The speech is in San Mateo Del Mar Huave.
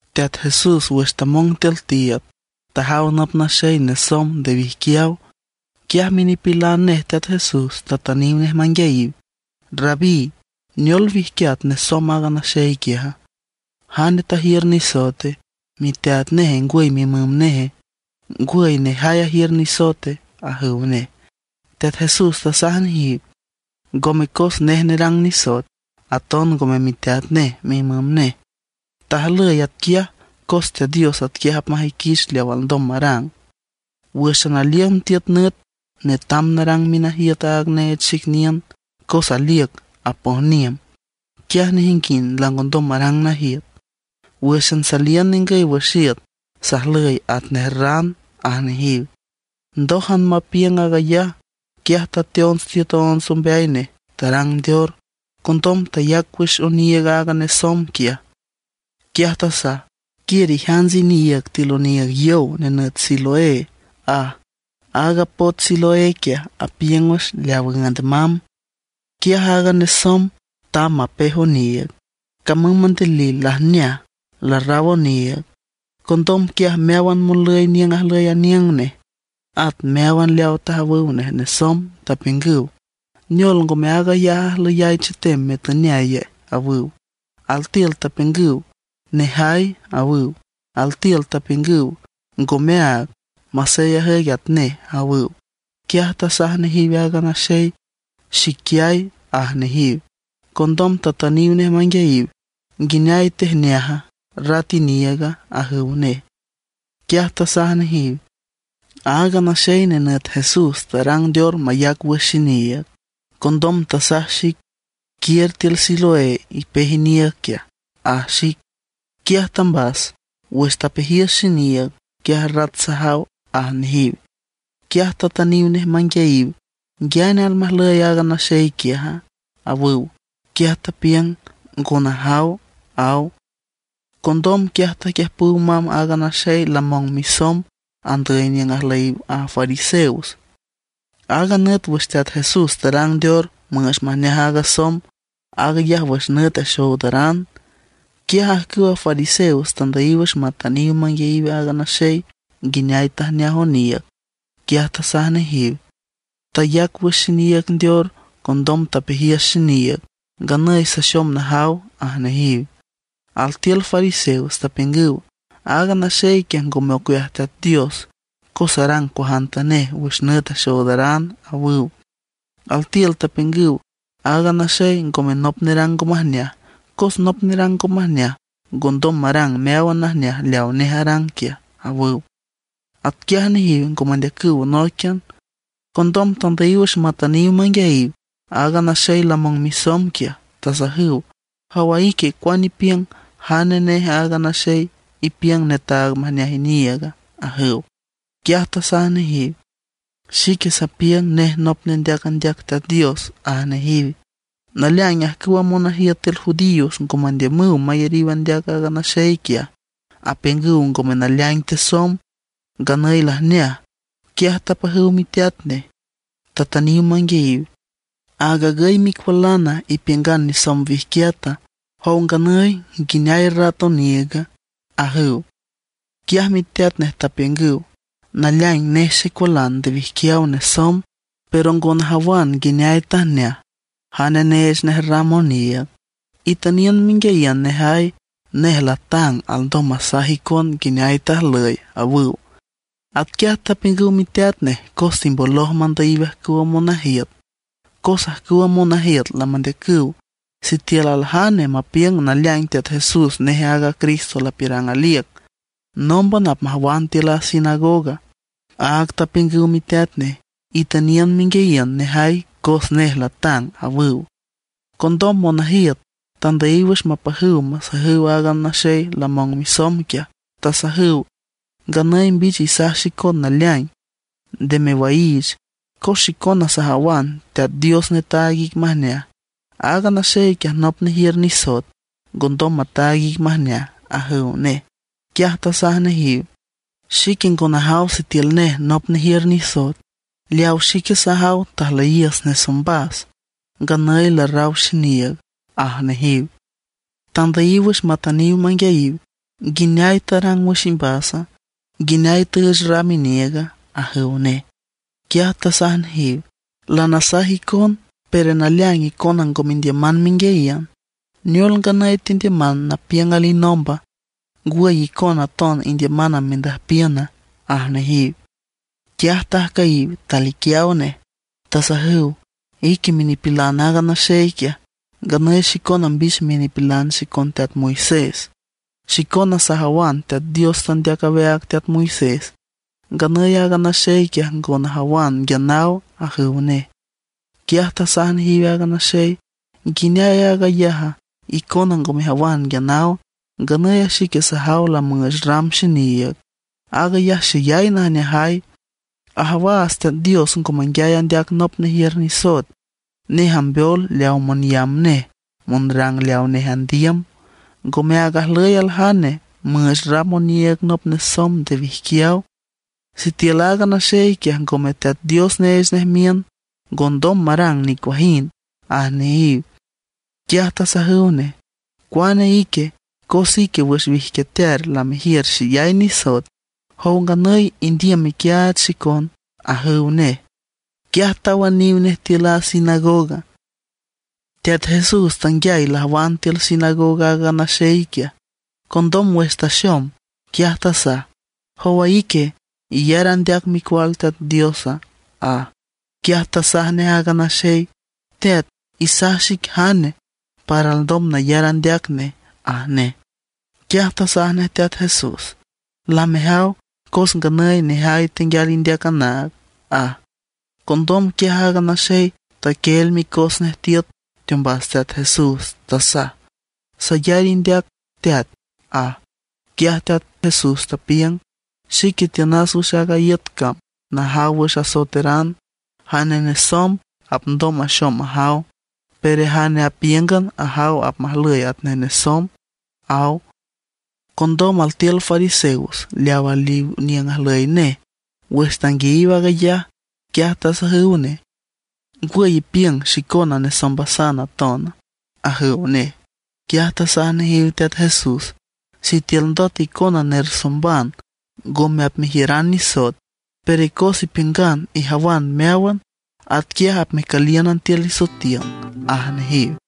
Teat Jesús wüx tamong tiül tiiüd, tajaw nop naxey nesomb nde wijquiaw. Quiaj minipilan nej Teat Jesús tatüniw nej manguiayiw: ―Rabí ¿neol wijquiat nesomb aaga naxey quiaja? ¿Jane tajiür nisoete, miteat neje ngwüy mimüm neje, ngwüy nejay ajiür nisoete? ―ajüw nej. Teat Jesús tasaj nejiw: ―Ngome cos nej nerang nisoet, taton ngome miteat nej mimüm nej. Tajlüy atquiaj cos Teat Dios atquiaj apmajüiquich leaw alndom marang. Wǘxan aliün tiüt nüt netam narang minajiüt aaga neech xic niün, cos aliüc apojniüm, quiaj nejinguind langondom marang najiüt. Wǘxan saliün ningüy wüx iüt, sajlüy atnej ran ―aj nejiw. Ndójan mapiüng aag ayaj, quiaj tateonts tiüt onts ombeay nej, tarang ndeor. Condom tayac wüx oniiüg aaga nesomb quiaj. Quiaj tasaj: ―Quiür ijants iniiüg tiül oniiüg yow nenüt Siloé ―aj. Aaga poch Siloé quiaj apiüng wüx leaw üünd mamb. Quiaj aaga nesomb tamb mapej oniiüg; camüm mandilil lajneaj, larraw oniiüg. Condom quiaj meáwan monlüy niüng ajlüy aniüng nej, at meáwan leaw tajawüw nej nesomb tapiüngüw: ―¿Neol, ngome aag ayaj ajlüyay chetem, metüneaye? ―awüw. Altiül tapiüngüw: ―Nejay ―awüw. Altiül tapiüngüw: ―Ngome áag, masey ajüic atnej ―awüw. Quiaj tasaj nejiw aaga naxey: ―Xiquiay ―aj nejiw. Condom tatüniw nej manguiayiw: ―¿Nguineay tejneaja, rat iniiüga? ―ajüw nej. Quiaj tasaj nejiw: ―Aaga naxey nenüt Jesús tarang ndeor mayac wüx xiniiüg, condom tasaj xic: “Quiür tiül Siloé, ipej iniiüg quiaj”, aj xic. Quiaj tambas. Wüx tapejiüs xiniiüg, quiaj rat sajaw ―aj nejiw. Quiaj tatüniw nej manguiayiw: ―¿Nguiane almajlüy aaga naxey quiaja? ―awüw. Quiaj tapiüng: ―Ngo najaw ―aw. Condom quiaj taquiüjpüw mamb aaga naxey lamong misomb andüy niüng ajlüyiw a fariseos. Aaga nüt wüx Teat Jesús tarang ndeor müüch majneaj aaga somb, aag ayaj wüx nüt axoodaran. Quiaj ajcüwa fariseos tandüyiw wüx matüniw manguiayiw aaga naxey nguineay tajneaj oniiüg. Quiaj tasaj nejiw: ―Tayac wüx xiniiüg ndeor. Condom tapejiüs xiniiüg, nganüy saxom najaw ―aj nejiw. Altiül fariseos tapiüngüw: ―Aaga naxey quiaj ngome ocueaj Teat Dios, cos arang cuajantanej wüx nüt axoodaran ―awüw. Altiül tapiüngüw: ―Aaga naxey ngome nop nerang ngo majneaj, cos nop nerang ngo majneaj ngondom marang meáwan najneaj leaw nej arang quiaj ―awüw. Atquiaj nejiw ngo mandeacüw nóiquian. Condom tandüyiw wüx matüniw manguiayiw aaga naxey lamong misomb quiaj, tasajüw: ―Jowa ique ¿cuane ipiüng, jane nej aaga naxey ipiüng netaag majneaj iniiüga? ―ajüw. Quiaj tasaj nejiw: ―Xique sapiüng nej nop nendeac andeac Teat Dios ―aj nejiw. Naleaing ajcüwa monajiüt tiül judíos ngo mandiümüw mayariw andeac aaga naxey quiaj; apiüngüw ngome naleaing tesomb, nganüy lajneaj. Quiaj tapajüw miteat nej, tatüniw manguiayiw: ―¿Aag agüy micualana, ipiüngan nesomb wijquiata? Jow nganüy, ¿nguineay rat oniiüga? ―ajüw. Quiaj miteat nej tapiüngüw: ―Naleaing nej xecualan nde wijquiaw nesomb. Pero ngo najawan nguineay tajneaj, jane neech nej ram oniiüg. Itüniün menguiayiün nejay; nej latang, alndom masaj icon nguineay tajlüy ―awüw. Atquiaj tapiüngüw miteat nej cos timboloj mandüyiw ajcüwa monajiüt, cos ajcüwa monajiüt lamandeacüw sitiül aljane mapiüng naleaing Teat Jesús nej aaga Cristo lapiürang aliüc, nómban apmajwan tiül a sinagoga. Áag tapiüngüw miteat nej: “Itüniün menguiayiün nejay cos nej latang”, awüw. Condom monajiüt tandüyiw wüx mapajüw masajüw aaga naxey lamong misomb quiaj, tasajüw: ―Nganüy mbich isaj xicon naleaing, nde mewaiich; cos xicona sajawan Teat Dios netaag ic majneaj; aaga naxey quiaj nop nejiür nisoet, ngondom mataag ic majneaj ―ajüw nej. Quiaj tasaj nejiw: ―Xique ngo najaw sitiül nej nop nejiür nisoet. Leaw xique sajaw tajlüyiüs nesombas, nganüy larraw xiniiüg ―aj nejiw. Tandüyiw wüx matüniw manguiayiw: ―¿Nguineay tarang wüx imbasa? ¿Nguineay tüüch ram iniiüga? ―ajüw nej. Quiaj tasaj nejiw: ―Lanasaj icon, pero naleaing icona ngo mendiüman menguiayiün. ¿Neol nganüy tendiüman napiüng alinomba? ¿Ngwüy, icona aton indiüman mendüjpiüna? ―aj nejiw. Quiaj tajcüyiw, taliquiaw nej, tasajüw: ―Ique minipilan aaga naxey quiaj, nganüy xicona mbich minipilan xicon teat Moisés. Xicona sajawan Teat Dios tandeac aweaag teat Moisés; nganüy aaga naxey quiaj ngo najawan nguia naw ―ajüw nej. Quiaj tasaj nejiw aaga naxey: ―¿Nguineay aag ayaja? Icona ngo mejawan nguia naw, nganüy a xique sajaw lamüüch ram xiniiüg, aag ayaj xeyay najneajay. Ajawaats Teat Dios ngo manguiay andeac nop nejiür nisoet; nej ambeol leaw monyamb nej, monrang leaw nej andiüm. Ngome áag ajlüy aljane müüch ram oniiüg nop nesomb nde wijquiaw. Sitiül aaga naxey quiaj ngome Teat Dios neech nej miün, ngondom marang nicuajind ―aj nejiw. Quiaj tasajüw nej: ―Cuane ique, cos ique wüx wijquiatear lamejiür xeyay nisoet. Jow nganüy indiüm mequiaach xicon ―ajüw nej. Quiaj tawüniw nej tiül a sinagoga. Teat Jesús tanguiay lajwan tiül sinagoga aaga naxey quiaj. Condom wüx taxom, quiaj tasaj: ―¿Jowa ique, iyar andeac Micual Teat Diosa? ―aj. Quiaj tasaj nej aaga naxey: ―Teat, isaj xic jane, para alndom nayar andeac nej ―aj nej. Quiaj tasaj nej Teat Jesús: ―Lamejaw, cos nganüy nejay tenguial indeac anaag ―aj. Condom quiaj aaga naxey taquieel micos nej tiüt teombas Teat Jesús, tasaj: ―Sayar indeac Teat ―aj. Quiaj Teat Jesús tapiüng: ―Xique tiünas wüx aaga iüt cam najaw wüx asoeteran. Jane nesomb apndom maxom majaw; pero jane apíüngan ajaw apmajlüy atnej nesomb ―aw. Condom altiül fariseos leaw aliw niüng ajlüy nej, wüx tanguiayiw aag ayaj, quiaj tasajüw nej: ―¿Ngwüy ipiüng xicona nesombasan atona? ―ajüw nej. Quiaj tasaj nejiw Teat Jesús: ―Sitiül ndot icona nersomban, ngome apmejiüran nisoet. Pero cos ipiüngan ijawan meáwan, atquiaj apmecülíünan tiül isoetiün ―aj nejiw.